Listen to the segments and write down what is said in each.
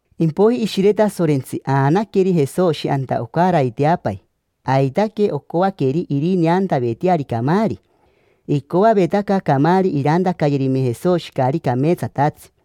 Impoiji Ishire Tasorentsi aanaqueri Jesoshi anta ocaraiteapai. Aitaque ocoaqueri irineantaveteari camaari. Icoavetaca camaari irantacayerime Jesoshi caari cameetsatatsi.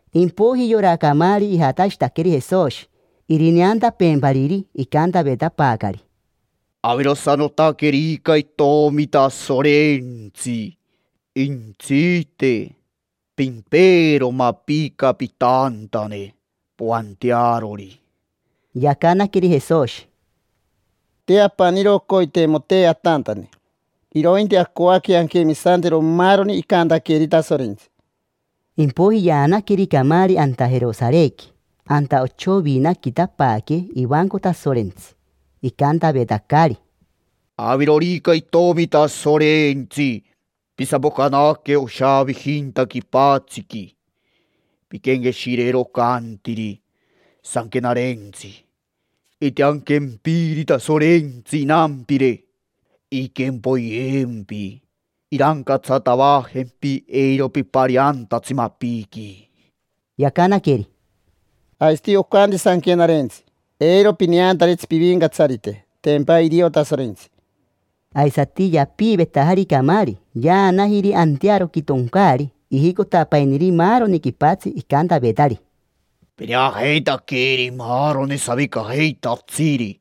Impoiji yora camaari ijatashitaqueri Jesoshi, irineantapeempariri. Icantavetapaacari: —Avirosanotaquerica Itomi Tasorentsi, jentsite, pimpeero mapica pitantane, poantearori. Yacanaqueri Jesoshi: —Te apaniro oncoiteimotee atantane, irointi acoaque anquemisantero maaroni icantaqueeri Tasorentsi. Impoiji yaanaqueri camaari anta Jerosarequi: anta ochoviinaquiitapaaque ivanco Tasorentsi. Icantavetacari: —Avirorica Itomi Tasorentsi, pisapocanaque oshaavijinta quipatsiqui. Pinquenqueshireero ocantiri Sanquenarentsi: “Intianquempiri Tasorentsi inampire inquempoyempi. Irancatsatavajempi eiro pipariantatsi mapiqui”. Yacanaqueri: —Aisati ocanti Sanquenarentsi: “Eiro pineantaritsi Pivincatsarite, tempa irio Tasorentsi”. Aisati yapiivetajari camaari, yaanajiri antearoqui toncaari. Ijicotapainiri maaroni quipatsi, icantavetari: —Pineajeitaqueri maaroni savicajeitatsiri,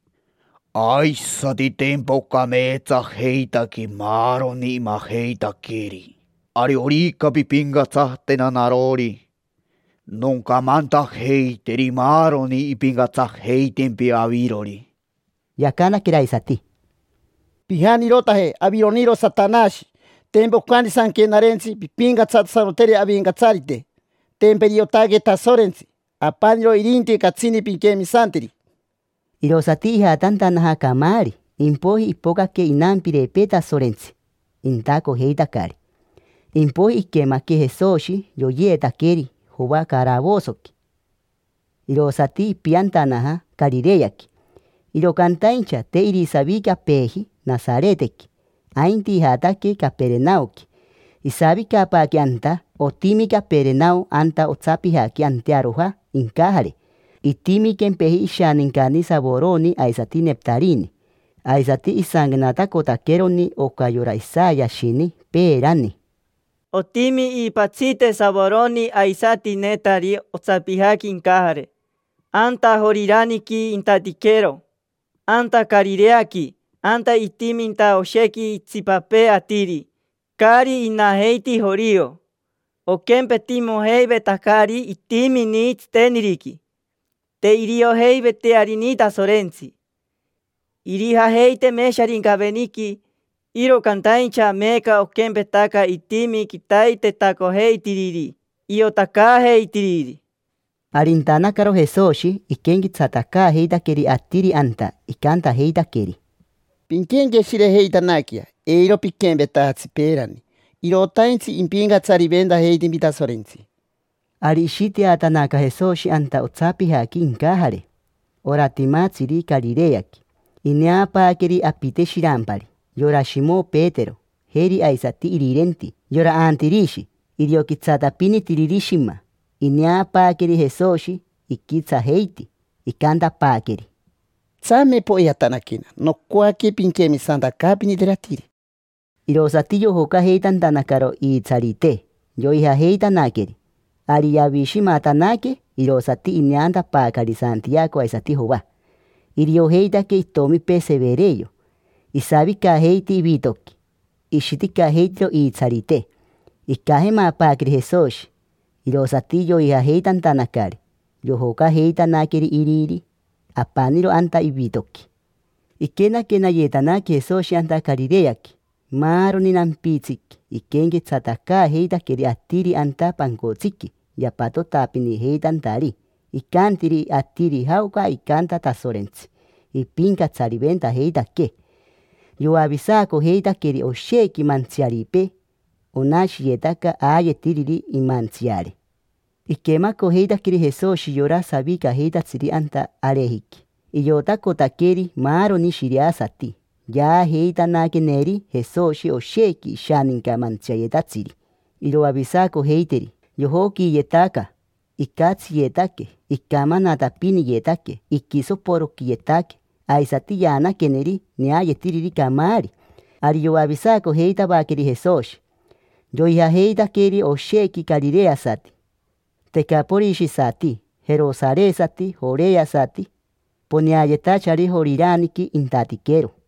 aisati tempa ocameetsajeitaque maaroni imajeitaqueri. Ariorica pimpincatsatena narori, noncamantajeiteri maaroni impincatsajeitempi avirori. Yacanaqueri aisati: —Pijanirotaje. Avironiro Satanashi. Tempa ocanti Sanquenarentsi: “Pimpincatsatasanoteri Avincatsarite, tempa iriotaque Tasorentsi. Apaniro irinti catsini pinquemisanteri”. Irosati ijatantanaja camaari. Impoiji ipocaque inampirepee Tasorentsi, intacojeitacari. Impoiji iquemaque Jesoshi yoyeetaqueri Joa caravosoqui, irosati ipiantanaja Carireaqui. Iro cantaincha te irisavicapeeji Nasaretequi, ainti ijataque Caperenaoqui, isavicapaaque anta. Otimi Caperenao anta otsapijaqui antearoja incajare. Otimi quempeji Savorono aisati Nejatari. Aisati isanquenatacotaqueroni oca yora Isayashini peerani: “Otimi Savorono aisati Nejatari otsapijaqui incajare, anta Joriraniqui intatiquero, anta Carireaqui. Anta itiminta oshequi itsipapee atiri, caari inajeiti jorio. Oquempetimojeivetacari itimini tsiteniriqui, te iriojeiveitearini Tasorentsi. Irijajeiteme Sharincaveniqui, iro cantaincha meeca oquempetaca itimi quitaitetacojeitiriri, iotacaajeitiriri”. Ari intanacarori Jesoshi iquenquetsatacaajeitaqueri atiri anta, icantajeitaqueri: —Pinquenqueshirejeitanaquea, eiro piquempetajatsi peerani. Irotaintsi impincatsariventajeitempi Tasorentsi. Ari ishiteatanaca Jesoshi anta otsapijaqui incajare: ora timatsiri Carireaqui. Ineapaaqueri apite shirampari, yora Shimo Petero, jeri aisati irirenti, yora Antirishi. Irio quitsatapinitiriri shima. Ineapaaqueri Jesoshi, iquitsajeiti, icantapaaqueri: —Tsame poijatanaquena. Nocoaque pinquemisantacaapiniteri atiri. Irosati yojocajeitantanacaro iitsarite, yoijajeitanaqueri. Ari yavishimatanaque irosati ineantapaacari Santiaco aisati Joa. Iriojeitaque itomipee Severeo. Isavicajeiti ivitoqui, ishiticajeitiro iitsarite. Icajemapaaqueri Jesoshi, irosati yoijajeitantanacari. Yojocajeitanaqueri iriri apaniro anta ivitoqui. Iquenaquenayetanaque Jesoshi anta Carireaqui. Maaroni nampitsiqui iquenquetsatacaajeitaqueri atiri anta pancotsiqui yapatotapinijeitantari. Icantiri atiri jaoca icanta Tasorentsi ipincatsariventajeitaquee. Yoavisaacojeitaqueri oshequi mantsiaripee: onashiyetaca aayetiriri imantsiare. Iquemacojeitaqueri Jesoshi yora savicajeitatsiri anta arejiqui: iotacotaqueri maaroni shiriasati. Yaajeitanaqueneri Jesoshi oshequi ishaninca mantsiayetatsiri iroavisacojeiteri. Yojoquiiyetaca, icatsiyetaque, icamanatapiniyetaque, iquisoporoquiyetaque. Aisati yaanaqueneri neayetiriri camaari. Ari yoavisacojeitavaqueri Jesoshi. Yoijajeitaqueri oshequi carireasati, tecaporishisati, jerosaresati, joreasati, poneayetachari Joriraniqui intatiquero.